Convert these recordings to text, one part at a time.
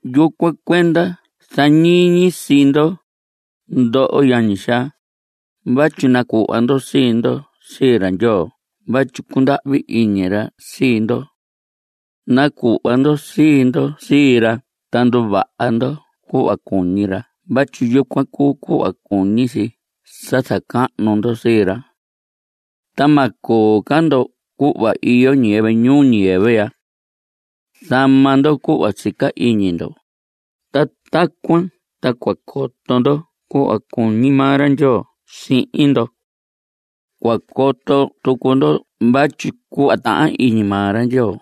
Yucuan cuenda zañiñi sii ndo, ndoho yañi xaa, vatyi nacuhva ndo sii ndo sii ra Ndyoo vatyi cundahvi iñi ra sii ndo. Nacuhva ndo sii ndo sii ra ta nduvaha ndo cuhva cuñi ra vatyi yucuan cuu cuhva cuñi si sa zacahnu ndo sii ra. Ta ma coo ca ndo cuhva iyo ñiyɨvɨ ñuu ñiyɨvɨ ya. Zama ndo cuhva sica iñi ndo. Ta tacuan ta cua coto ndo cuhva cuñi maa ra Ndyoo sihin ndo. Cua coto tucu ndo vatyi cuhva tahan iñi maa ra Ndyoo,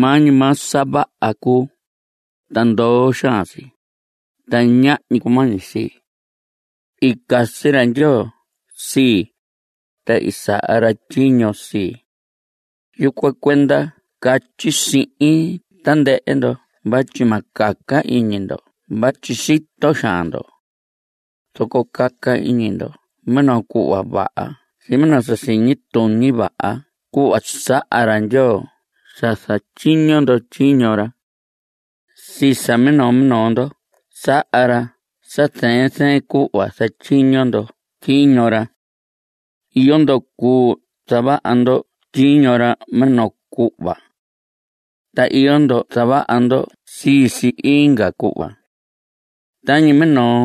maa ñi maa sa vaha cuu, ta ndoo xaan si, ta ñahñi cumañi si. I casi ra Ndyoo sii, ta i saha ra tyiño sii. Yucuan cuenda catyi sihin tandɨhɨ ndo vatyi ma caca iñi ndo vatyi sito xaan ndo. Zoco caca iñi ndo minoo cuhva vaha sihin minoo sa siñi tuñi vaha cuhva saha ra Ndyoo sa zatyiño ndo tyiño ra. Sii sa minoo minoo ndo saha ra sa zɨɨn zɨɨn cuhva zatyiño ndo tyiño ra. Iyo ndo cuu zavaha ndo tyiño ra minoo cuhva. Ta iyo ndo zavaha ndo sii si inga cuhva. Tañi minoo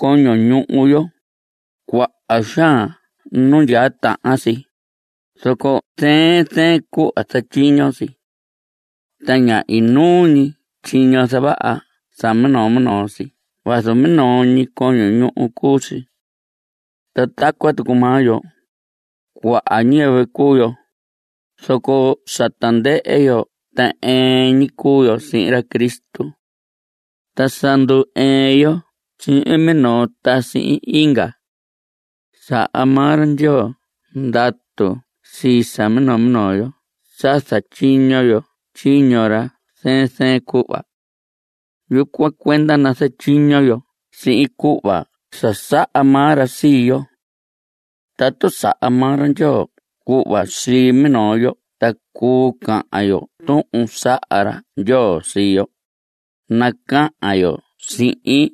coño ñuhu yo, cuaha xaan nu ndyaa tahan si, zoco zɨɨn zɨɨn cuhva zatyiño si. Ta ña inuu ñi tyiño zavaha sa minoo minoo si vazu minoo ñi coño ñuhu cuu si. Ta tacuan tucu maa yo, cuaha ñiyɨvɨ cuu yo, zoco sa tandɨhɨ yo ta ɨɨn ñi cuu yo sihin ra Cristo. Ta sa ndu‑ɨɨn yo sihin minoo ta inga. Saha maa ra Ndyoo ndatu sii sa minoo minoo yo sa zatyiño yo tyiño ra zɨɨn zɨɨn cuhva. Yucuan cuenda nazatyiño yo sihin cuhva sa saha maa ra sii yo. Tatu saha maa ra Ndyoo cuhva sii minoo yo ta cuu cahan yo tuhun saha ra Ndyoo sii yo, nacahan yo sihin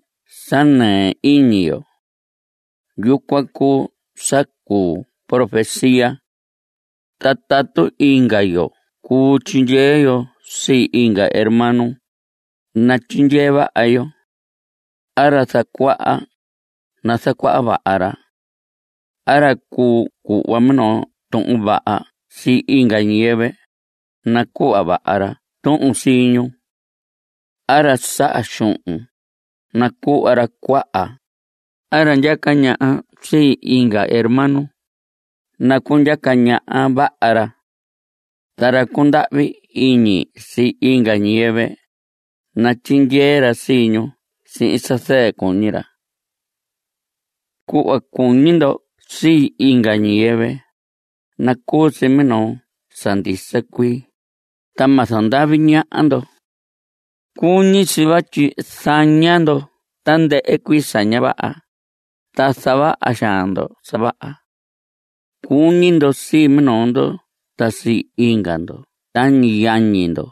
sa nɨɨ iñi yo. Yucuan cuu sa cuu profecía. Ta tatu inga yo cuu tyindyee yo sii inga hermano, natyindyee vaha yo. A ra zacuaha, nazacuaha vaha ra. A ra cuu cuhva minoo tuhun vaha sii inga ñiyɨvɨ, nacuhva vaha ra tuhun sii ñu. A ra saha xuhun, nacuhva ra cuaha. A ra ndyaca ñaha sii inga hermano, nacundyaca ñaha vaha ra. Ta ra cundahvi iñi sii inga ñiyɨvɨ, natyindyee ra sii ñu sihin sa zɨɨ cuñi ra. Cuhva cuñi ndo sii inga ñiyɨvɨ, nacuu si minoo sa ndisa cuii, ta ma zandavi ñaha ndo. Cuñi si vatyi zaña ndo tandɨhɨ cuii sa ña vaha, ta zavaha xaan ndo sa vaha. Cuñi ndo sii minoo ndo ta sii inga ndo tañi yañi ndo.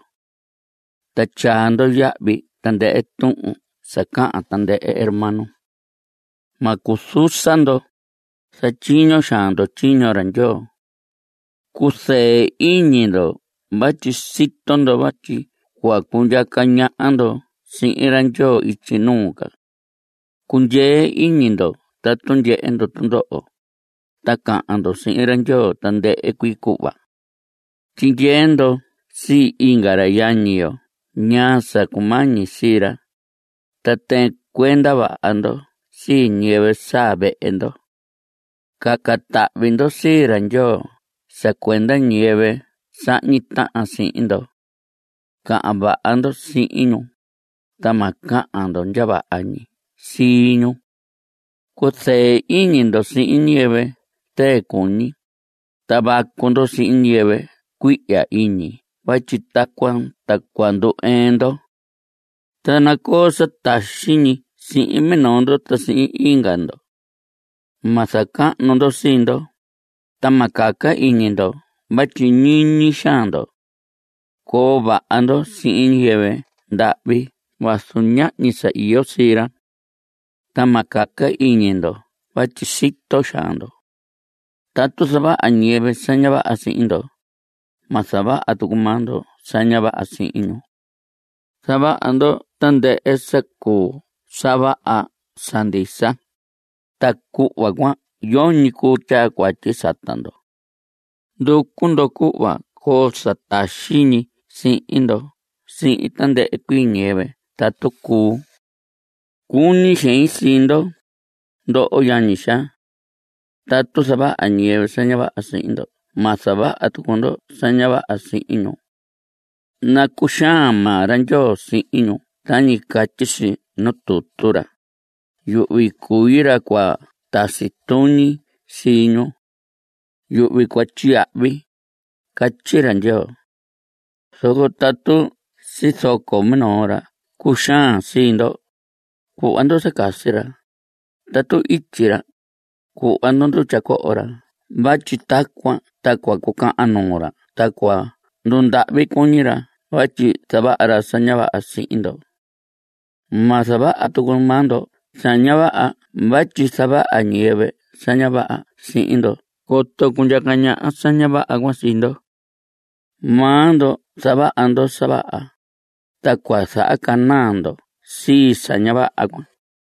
Ta tyaa ndo yahvi tandɨhɨ tuhun sa cahan tandɨhɨ hermano. Ma cuzusa ndo. Zatyiño xaan ndo tyiño ra Ndyoo. Cuzɨɨ iñi ndo vatyi sito ndo vatyi cua cundyaa ndo sihin ra Ndyoo ityi nuu ca. Cundyee iñi ndo tatu ndyehe ndo tundoho, ta cahan ndo sihin ra Ndyoo tandɨhɨ cuii cuhva. Tyindyee ndo sii inga ra yañi yo ñaa sa cumañi sii ra, ta tɨɨn cuenda vaha ndo sii ñiyɨvɨ saa vehe ndo. Caca tahvi ndo sii Ndyoo sa cuenda ñiyɨvɨ sahñi tahan sihin ndo. Cahan vaha ndo sihin ñu, ta ma cahan ndo ndya vaha ñi sii ñu. Cuzɨɨ iñi ndo sihin ñiyɨvɨ zɨɨ cuñi, ta vacu ndo sihin ñiyɨvɨ cuihya iñi vatyi tacuan ta cua ndu‑ɨɨn ndo. Ta nacoo sa taxi ñi sihin minoo ndo ta sihin inga ndo. Ma zacahnu ndo sii ndo, ta ma caca iñi ndo vatyi ñiñi xaan ndo. Coo vaha ndo sihin ñiyɨvɨ ndahvi vazu ñahñi sa iyo sii ra. Ta ma caca iñi ndo vatyi sito xaan ndo. Tatu zavaha ñiyɨvɨ sa ña vaha sihin ndo, ma zavaha tucu maa ndo sa ña vaha sihin ñu. Zavaha ndo tandɨhɨ sa cuu sa vaha sa ndisa, ta cuhva cuan yoñi cuu tyaa cuatyi sata ndo. Nducu ndo cuhva coo sa taxi ñi sii ndo sihin tandɨhɨ cuii ñiyɨvɨ tatu cuu. Cuñi xein sii ndo, ndoho yañi xaa. Tatu zavaha ñiyɨvɨ sa ña vaha sihin ndo ma zavaha tucu ndo sa ña vaha sihin ñu. Nacuxaan maa ra Ndyoo sihin ñu tañi catyi si nuu tutu ra: “Yuhvi cui ra cua tasi tuñi sii ñu. Yuhvi cua tyiyahvi”, catyi ra Ndyoo. Zoco tatu sizoco minoo ra cuxaan sii ndo, cuhva ndo sa casi ra. Tatu ityi ra, cuhva ndo ndutya coho ra vatyi tacuan ta cua cucahan nuu ra ta cua ndundahvi cuñi ra vatyi zavaha ra sa ña vaha sihin ndo. Ma zavaha tucu maa ndo sa ña vaha vatyi zavaha ñiyɨvɨ sa ña vaha sihin ndo coto cundyaca ñaha sa ña vaha cuan sii ndo. Maa ndo zavaha ndo sa vaha, ta cua zahacanaa ndo sii sa ña vaha cuan.